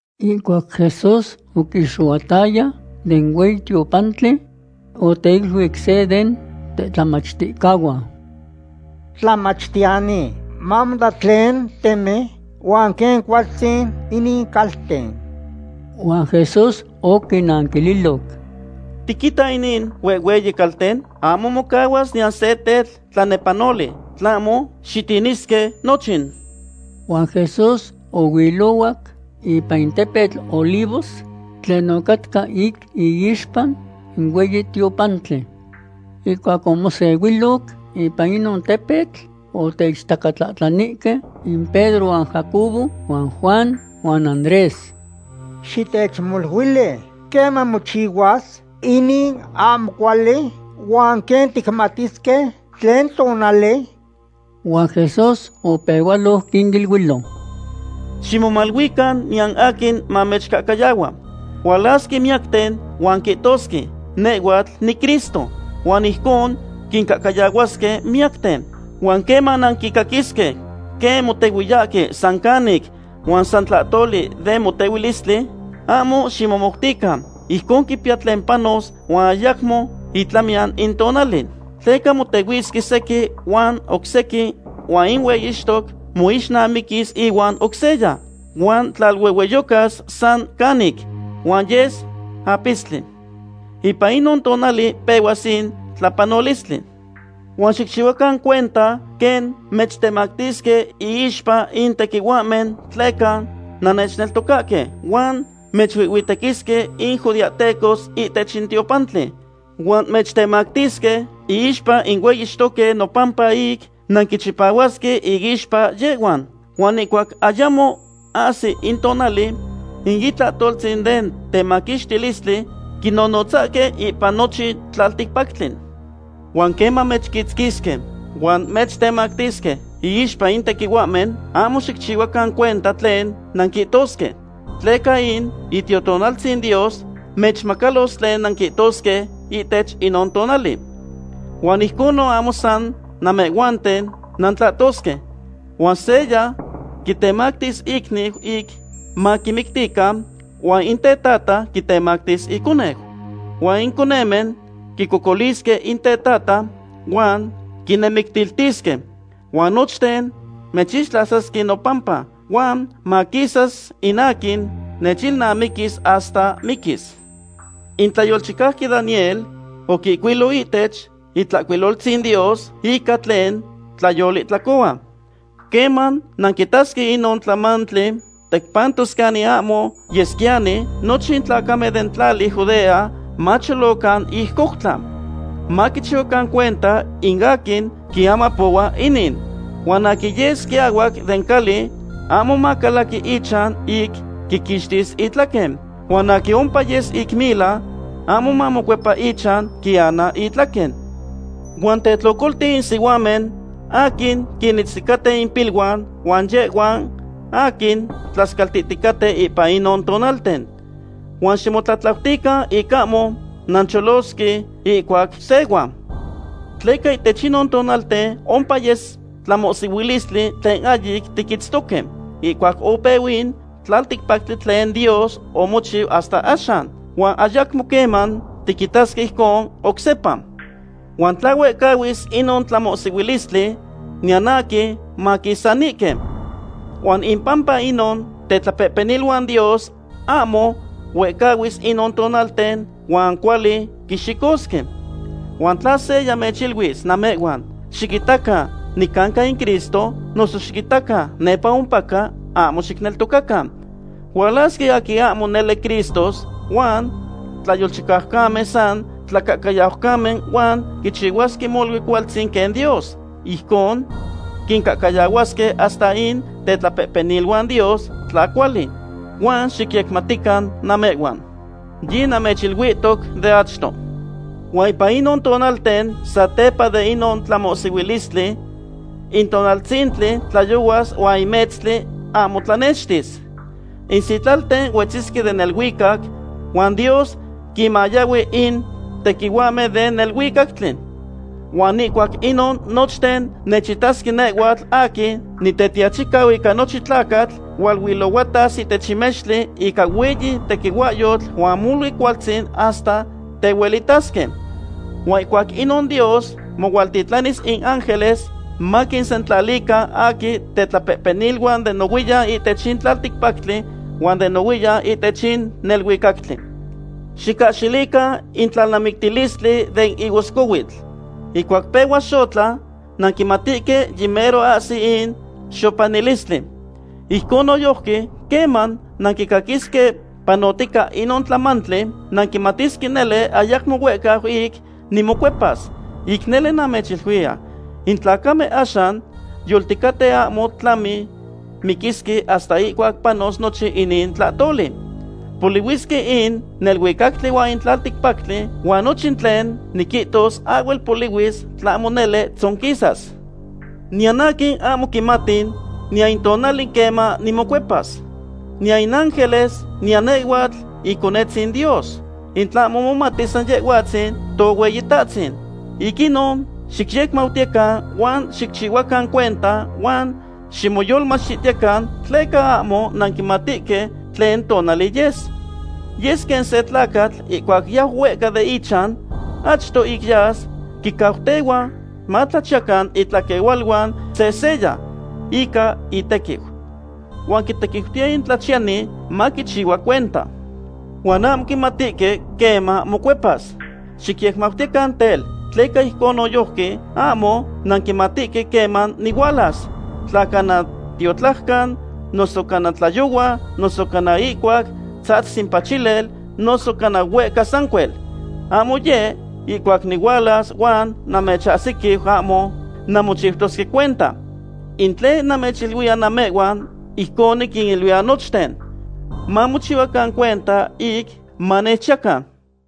Ihcuac Jesús oquixohuataya den hueyi tiopantli, oteiluic se den tetlamachticahuan: ―¡Tlamachtiyani, mamota tlen temen huan quen cualtzin inin calten! Huan Jesús oquinanquililoc: ―¿Tiquita inin huehhueyi calten? Ahmo mocahuas niyan se tetl tlanepanoli, tlahmo xitinisque nochin. Huan Jesús ohuilohuac ipan in tepetl Olivos tlen ocatca ic iixpa in hueyi tiopantli. Ihcuac omosehuiloc ipan inon tepetl, oteichtacatlahtlanihque in Pedro huan Jacobo huan Juan huan Andrés: ―Xitechmoluili: ¿queman mochihuas inin ahmo cuali huan quen ticmatisque tlen tonali? Huan Jesús opehualoc quiniluilo: ―Ximomaluican niyan aquin mamechcahcayahua. Hualasque miyacten huan quihtosque: “Nehhuatl niCristo”, huan ijcon quincahcayahuasque miyacten. ’Huan queman nanquicaquisque quen motehuiyahque san canic huan san tlahtoli den motehuilistli, ahmo ximomoutican. Ijcon quipiya tlen panos huan ayamo itlamiyan in tonali. Tleca motehuisque sequin huan oc sequin huan in hueyixtoc moixnamiquis ihuan oc seya, huan tlaluehueyocas san canic, huan yes apistli. Ipan inon tonali pehuas in tlapanolistli. ’Huan xicchihuacan cuenta quen mechtemactisque iixpa in tequihuahmen tleca nannechneltocahque, huan mechuihhuitequisque in judeahtecos ihtech in tiopantli, huan mechtemactisque iixpa in hueyixtoque nopampa ic nanquichipahuasque inixpa yehhuan. Huan ihcuac ayamo ahsi in tonali, in itlahtoltzin den temaquixtilistli quinonotzasque ipan nochin tlalticpactli. Huan queman mechquitzquisque huan mechtemactisque iixpa in tequihuahmen, ahmo xicchihuacan cuenta tlen nanquihtosque. Tleca in Itiotonaltzin Dios mechmacalos tlen nanquihtosque ihtech inon tonali. Huan ijcon ahmo san namehhuanten nantlahtosque. Huan seya quitemactis icniu ic maquimictican huan in tetata quitemactis iconeu. Huan in conemen quicocolisque in tetata huan quinemictiltisque. Huan nochten mechixtlasasque nopampa, huan maquisas in aquin nechilnamiquis hasta miquis. ’In tlayolchicauqui Daniel oquihcuilo ihtech Itlahcuiloltzin Dios ica tlen tlayolihtlacohua. Queman nanquitasque inon tlamantli tecpantos canin ahmo yesquiyani, nochten in tlacamen den tlali Judea macholocan ic coutla. Maquichihuacan cuenta in aquin quiamapohua inin. Huan aquin yes quiahuac den cali ahmo macalaqui ichan ic quiquixtis itlahtlen. Huan aquin ompa yes ic mila ahmo mamocuepa ichan quiana itlaquen. Huan tetlocolti in sihuamen aquin quinitzticaten impiluan huan yehhuan aquin tlascaltihticaten ipan inon tonalten. Huan ximotlatlautican ic ahmo nancholosque ihcuac sehua. Tleca ihtech inon tonalten ompa yes tlamohsihuilistli tlen ahyic tiquitztoque ihcuac opeu in tlacticpactli tlen Dios omochiu hasta axan, huan ayacmo queman tiquitasque ijcon oc sepa. Huan tla huehcahuis inon tlamohsihuihstli, niyan aquin maquisanihque. Huan impampa inon tetlapehpeniluan Dios ahmo huehcahuis inon tonalten huan cuali quixicosque. ’Huan tla seya mechiluis namehhuan: “Xiquitacan, nicanca in Cristo”, noso “Xiquitacan, nepa ompaca”, ahmo xicneltocacan. Hualasque aquin ahmo nele cristos huan tlayolchicaucamen san tlacahcayaucamen huan quichihuasque molui cualtzin quen Dios. Ijcon quincahcayahuasque hasta in tetlapehpeniluan Dios tla cuali. Huan xicyecmautican namehhuan. Yinamechiluihtoc de achto. ’Huan ipan inon tonalten satepa de inon tlamohsihuilistli, in tonaltzintli tlayohuas huan in metztli ahmo tlanextis. In sitlalten huetzisque den neluicac, huan Dios quinmayahui in tequihuahmen den neluicactli. Huan ihcuac inon nochten nechitasque nehhuatl aquin Nitetiachicau ica nochin tlacatl hualuilohuatas ihtech in mextli ica hueyi tequihuahyotl huan molui cualtzin hasta tehuelitasque. Huan ihcuac inon Dios mohualtitlanis in ángeles maquinsentlalican aquin tetlapehpeniluan de nohuiyan ihtech in tlalticpactli huan de nohuiyan ihtech in neluicactli. ’Xicahxilican in tlalnamictilistli den higoscohuitl. Ihcuac pehua xotla nanquimatihque yimero ahsi in xopanilistli. Ijcon noyojqui queman nanquitasque panotica inon tlamantli, nanquimatisque nele ayacmo huehca ic nimocuepas. Ic nele namechiluiya, in tlacamen axan yolticaten ahmo tlami miquisque hasta ihcuac panos nochin inin tlahtoli. Polihuisque in neluicactli huan in tlalticpactli huan nochin tlen niquihtos ahhuel polihuis tlahmo nele tzonquisas. ’Niyan aquin ahmo quimati niyan in tonali queman nimocuepas. Niyan in ángeles niyan nehhuatl Iconetzin Dios. In tlahmo momati san Yehhuatzin Tohueyitahtzin. ’Ic inon xicyecmautiyecan huan xicchihuacan cuenta huan ximoyolmachtihtican, tleca ahmo nanquimatihque tlen tonali yes. Yes quen se tlacatl ihcuac yau huehca den ichan. Achto ic yas quincautehua matlachiyacan itlaquehualuan sehseya ica intequiu. Huan quitequiutiya in tlachiyani maquichihua cuenta. Huan ahmo quimatihque queman mocuepas. Xicyecmautiyecan tel, tleca ijcon noyojqui ahmo nanquimatihque queman nihualas, tla cana tiotlajcan, noso cana tlayohua, noso cana ihcuac tzahtzis in pachilel, noso cana huehca sancuel. Ahmo yeh ihcuac nihualas huan namechahsiquiu ahmo nanmochiutosque cuenta. In tlen namechiluiya namehhuan, ijcon niquiniluiya nochten: Mamochihuacan cuenta ic manechchiyacan.